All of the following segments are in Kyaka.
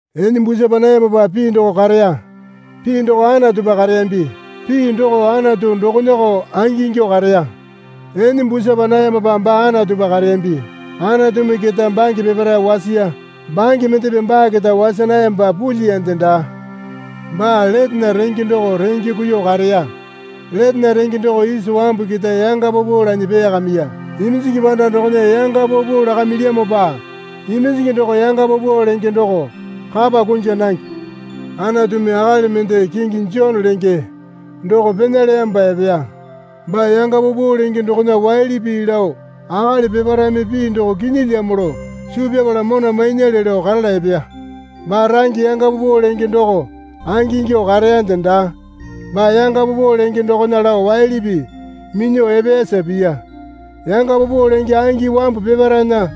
Ene busapa nayamopa Pii doko kareya. Pii doko Anatupa kareyambi. Pii doko Anatu dokonako angingyuo kareya. Ene busapa nayamopa baa Anatupa kareyambi. Anatumi keta bange peparae wasiya. Bange mendepe baa keta wasa nayamopa pulyiyande daa. Baa letena renge doko renge kuiyuo kareya. Letena renge doko isa wambu keta yanga paupau lanyi peeyakamiya. Iminjingi panda dokona yanga paupau lakamilyamopa iminjingi doko yanga paupau lenge doko kapa kunja nange. Anatumi akali mende kingi Jone lenge doko pena leyamopa epeya. Baa yanga paupau lenge dokona waili pii lao akali peparaeme pii doko kinyilyamo lao suu pyapala mona mainyale lao karala epeya. Baa range yanga paupau lenge doko angingyuo kareyande daa. Baa yanga paupau lenge dokona lao waili pii minyuo epeyasa piya. Yanga paupau lenge angi wambu peparaena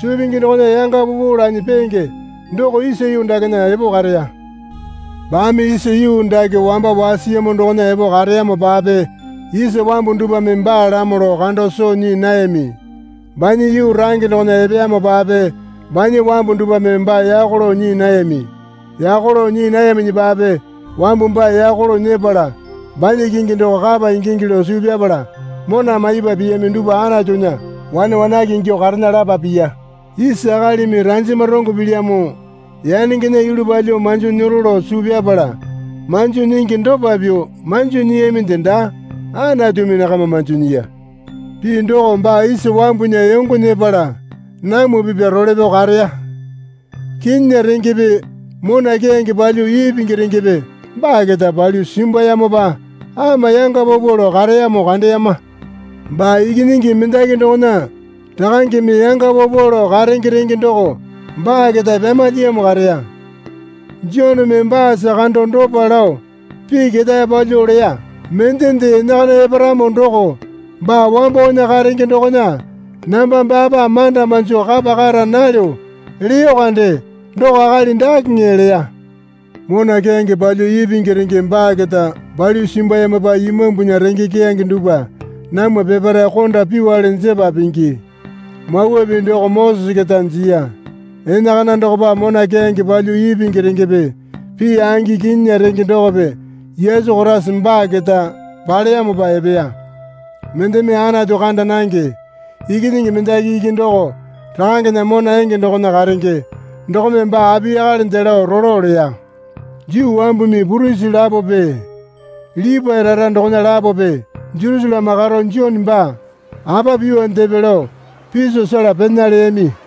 suu pingi dokona yanga paupau lanyi peenge doko isa yuu dakena epo kareya. Baame isa yuu dake wamba wasiyamo dokona epo kareyamopape isa wambu dupwame baalamo lao kando soo nyii nayami. Banya yuu range dokona epeyamopape banya wambu dupwame baa yako lao nyii nayami. Yako lao nyii nayaminyipape wambu baa yako lao nyepala banya kingi doko kapa ingingi lao suu pyapala mona maipa piyami dupwa Anatunya wane wanake ingyuo karena lapa piya. Isa akalimi ranjama rongo pilyamo yanengena yulu palyuo manjo nyero lao suu pyapala manjo nyingi dopa pyuo manjo nyiyaminde daa. Anatumi nakama manjo nyiya. Pii doko baa isa wambunya yongo nyepala namwa pipya role pyao kareya. Kinyinya rengepe mona keyange palyuo ipingi rengepe baa keta palyuo simbuyamopa ama yanga paupau lao kareyamo kandeyama. Baa Ikinyingi mendaki dokona Rakangeme yanga paupau lao karenge renge doko baa keta pyamalyiyamo kareya. Joneme baasa kando dopa lao pii ketae palyuo leya. Mendende enakana eparamo doko baa wambowana karenge dokona namba baapa manda manjo kapa kara nalyo leyo kande doko akali dakeŋe leya. Mona keyange palyuo ipingi renge baa keta palyuo simbulyamopa imambunya renge keyange dupwa namwa peparae konda pyuole jepa pingi. Mawa Pii doko Mosese keta jiya. Enakana dokopa mona keyange palyuo ipingi rengepe pii angi kinyinya renge dokope Yesu Koraisa baa keta paleyamopa epeya. Mendeme Anatu kanda nange. Ikinyingi mendaki iki doko Rakangena mona enge dokona karenge dokome baa apiyakalende lao rolo leya. Juu wambumi purisi lapope Lipae rara dokona lapope Jerusaleme karo Jone baa apa pyuondepe lao piso sela pena leyami.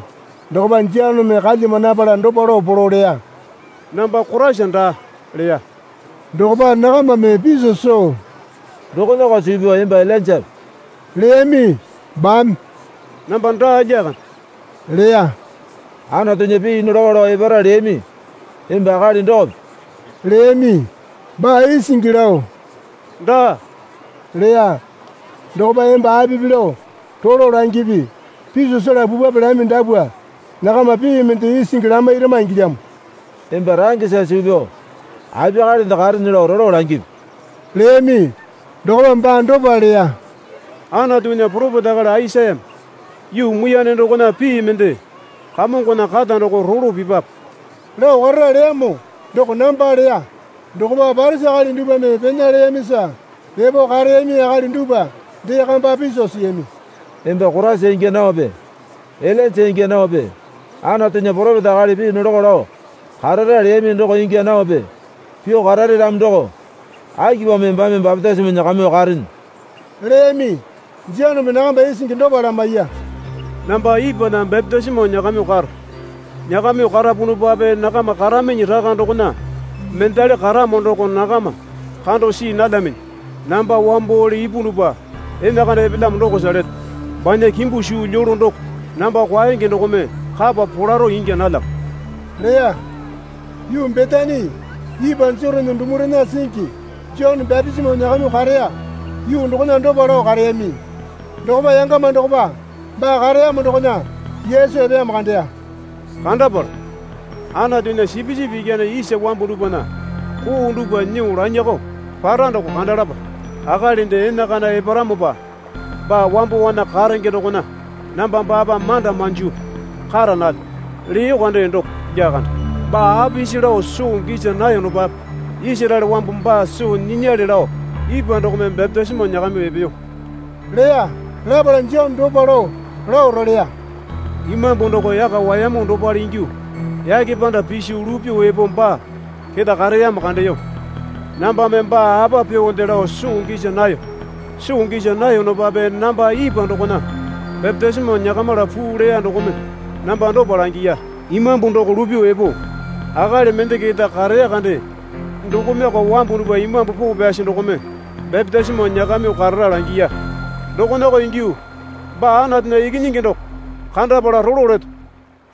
Dokopa Joneme kalyama napala dopa lao polo leya. Namba Koraisa daa, leya. Dokopa nakamame piso soo, Dokonako suu pyao emba Ilainjape? leyami. Baame, Namba daa lyakande, leya. Anatunya pii nolako lao epara leyami emba akali dokope? leyami. Baa isingi lao, Daa leya. Dokopa emba apipi lao rolo langipi. Piso sela pupwape lami dapwa nakama pii mende isingi lamairama ingilyamo. Emba rangesa suu pyao apiyakalende karene lao rolo langipi leyami. Dokopa baa dopa leya. Anatunya poropeta akali Aisayame. Yuu muiyane dokona pii mende, Kamongona kata doko rolo pipwape, Lao karara leyamo doko namba, leya. Dokopa Parisi akali dupwame pena leyamisa epo kareyami akali dupwa dee kamba piso siyami. Emba Koraisa ingya naope Ilainja ingya naope Anatunya poropeta akali pii nolako lao karara leyami doko ingya naope pyuo karare ramo doko akipamo embame bapitisimo nyakamyuo karene? leyami. Joneme nakama isingi dopa lamaiya. Namba ipwana bapitisimo nyakamyuo karo. Nyakamyuo karapunupape nakama karaminyi raka dokona mendali karamo doko nakama kando see nalyaminyi. Namba wambole ipunupa enakana epelyamo dokosa leto. Banya kimbu suu lyolo doko namba kwaenge dokome kapa polaro ingya nalyamo leya. Yuu Betani ipwa Jotane dumarena singi Jone bapitisimo nyakamyuo kareya yuu dokona dopa lao kareyami. Dokopa yangama dokopa baa kareyamo dokona Yesu epeyamo kandeya. Kandapala, Anatunya Sipisipi Ikyane isa wambu dupwana koo dupwa nyuo lanyakao para doko kandalapa. Akalinde enakana eparamopa baa wambowana karenge dokona namba baapa manda manjo kara nalyo leyo kande doko lyakande. Baa apisi lao soo gisa nayonopape Isaraele wambu baa soo nyinyale lao ipwa dokome bapitisimo nyakamyuo epeyo leya. Lapala Jone dopa lao lao roleya. Imambu doko yaka wayamu dopale ingyuo yake panda piso lupyuo epo baa keta kareyamo kandeyo. Nambame baa apa pyuonde lao soo gisa nayo. Soo gisa nayonopape namba ipwa dokona bapitisimo nyakamila puu leya dokome namba dopa langiya. Imambu doko lupyuo epo akali mende keta kareya kande dokomeko wambu dupwa Imambu Poo Pyasi dokome bapitisimo nyakamyuo karara langiya. Dokonako ingyuo baa Anatunya Ikinyingi doko kandapala rolo leto,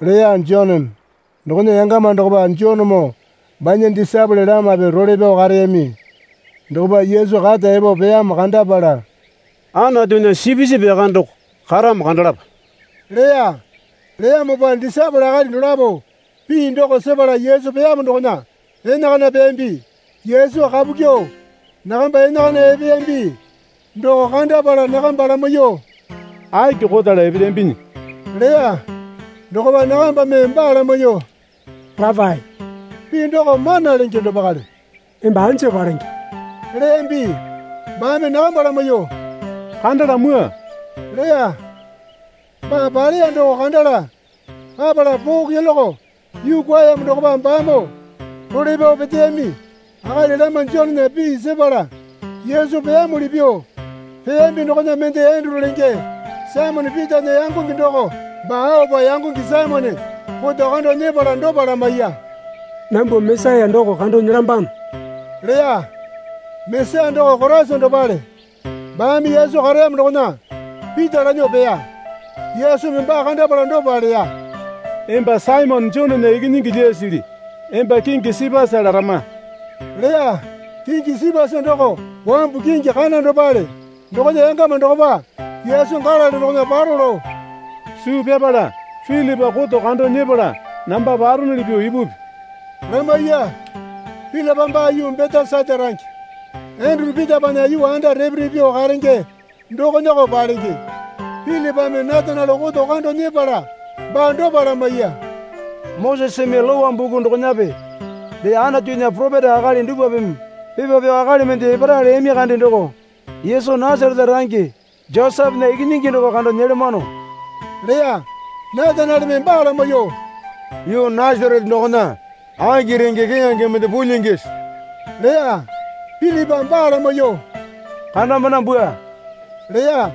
leya Joneme. Dokona yangama dokopa Jonemoo banya disaepole lamape role pyao kareyami. Dokopa Yesu kata epo peyamo kandapala, Anatunya Sipisipi Yakane doko karamo kandalapa leya. Leyamopa disaepole akali dolapo pii doko sepala Yesu peyamo dokona enakana peyambi. Yesu kapu kyuo nakamba enakana epeyambi doko kandapala nakamba lamaiyuo, Aki kotala epelyambinyi? leya. Dokopa nakambame baa lamaiyuo, Rapae (pii doko Mana Lenge dopakale), emba anja palenge? leyambi. Baame nakamba lamaiyuo, Kandala mwua leya. Baa Paleya doko kandala papala poo keloke yuu kwuayamo dokopa baamoo role pyao peteyami. Akali lama Jonena pii sepala Yesu peyamuli pyuo peyambi dokona mende Enduru lenge Saimone Pitana yangonge doko. Baa aopa yangonge Saimone koto kando nyepala dopa lamaiya. Nambwa Mesaya doko kando nyelambano, leya. (Mesaya doko Koraisa dopale.) Baame Yesu kareyamo dokona Pita lanyuo peya. Yesumi baa kandapala dopa leya. Emba Saimone Jonena ikinyingi lyasili. Emba kingi Sipasa larama leya. (Kingi Sipasa doko wambu kingi kana dopale.) Dokona yangama dokopa Yesu Galili dokona paro lao suu pyapala Pilipa koto kando nyepala namba paronuli pyuo ipupi, lamaiya. Pilipa baa yuu Betesaita range Enduru Pitapana yuu anda repe repe pyuo karenge dokonako palenge. Pilipame Nataniele koto kando nyepala baa dopa lamaiya. Moseseme Lowa buku dokonape dee Anatunya poropeta akali dupwapeme pepa pyao akali mende epara leyami kande doko Yesu Nasarete range Josepena ikinyingi doko kando nyelamano leya. Natanieleme baa lamaiyuo, Yuu Nasarete dokona aki renge keyange mende pulyingisi? leya. Pilipa baa lamaiyuo, Kandambana bwua leya.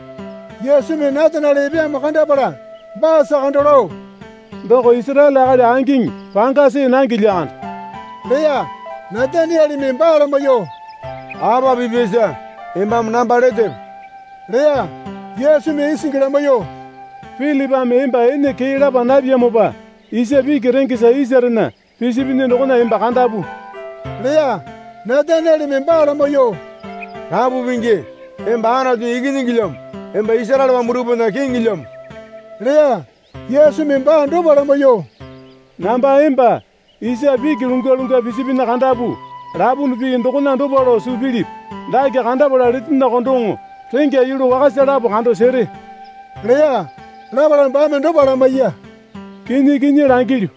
Yesumi Nataniele epeyamo kandapala baasa kando lao, Doko Isaraele akali angiŋi panga see nange lyakande leya. Natanieleme baa lamaiyuo, Apa pipyasa embame namba letepe? leya. Yesumi isingi lamaiyuo, Pilipame emba ene kee lapa napyamopa isa piki rengesa isarena pisipinyi dokona emba kandapu leya. Natanieleme baa lamaiyuo, Rapu Pingi emba Anatunya Ikinyingilyamo emba Isaraele wambu dupwana Kiŋilyamo leya. Yesumi baa dopa lamaiyuo, Namba emba isa piki lungwalungwa pisipinyi kandapu, lapunu pii dokona dopa lao suu pilipi? Dake kandapala letenyakao doŋo rengya yulu wakasa lapo kando sere leya. Lapala baame dopa lamaiya. Kinyi kinyi langilyu,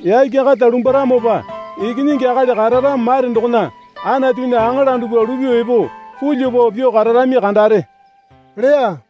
yake kata lumbwaramopa Ikinyingi Akali kararamo mare dokona Anatunya aŋala dupwa lupyuo epo pulyuo pao pyuo kararami kandare leya.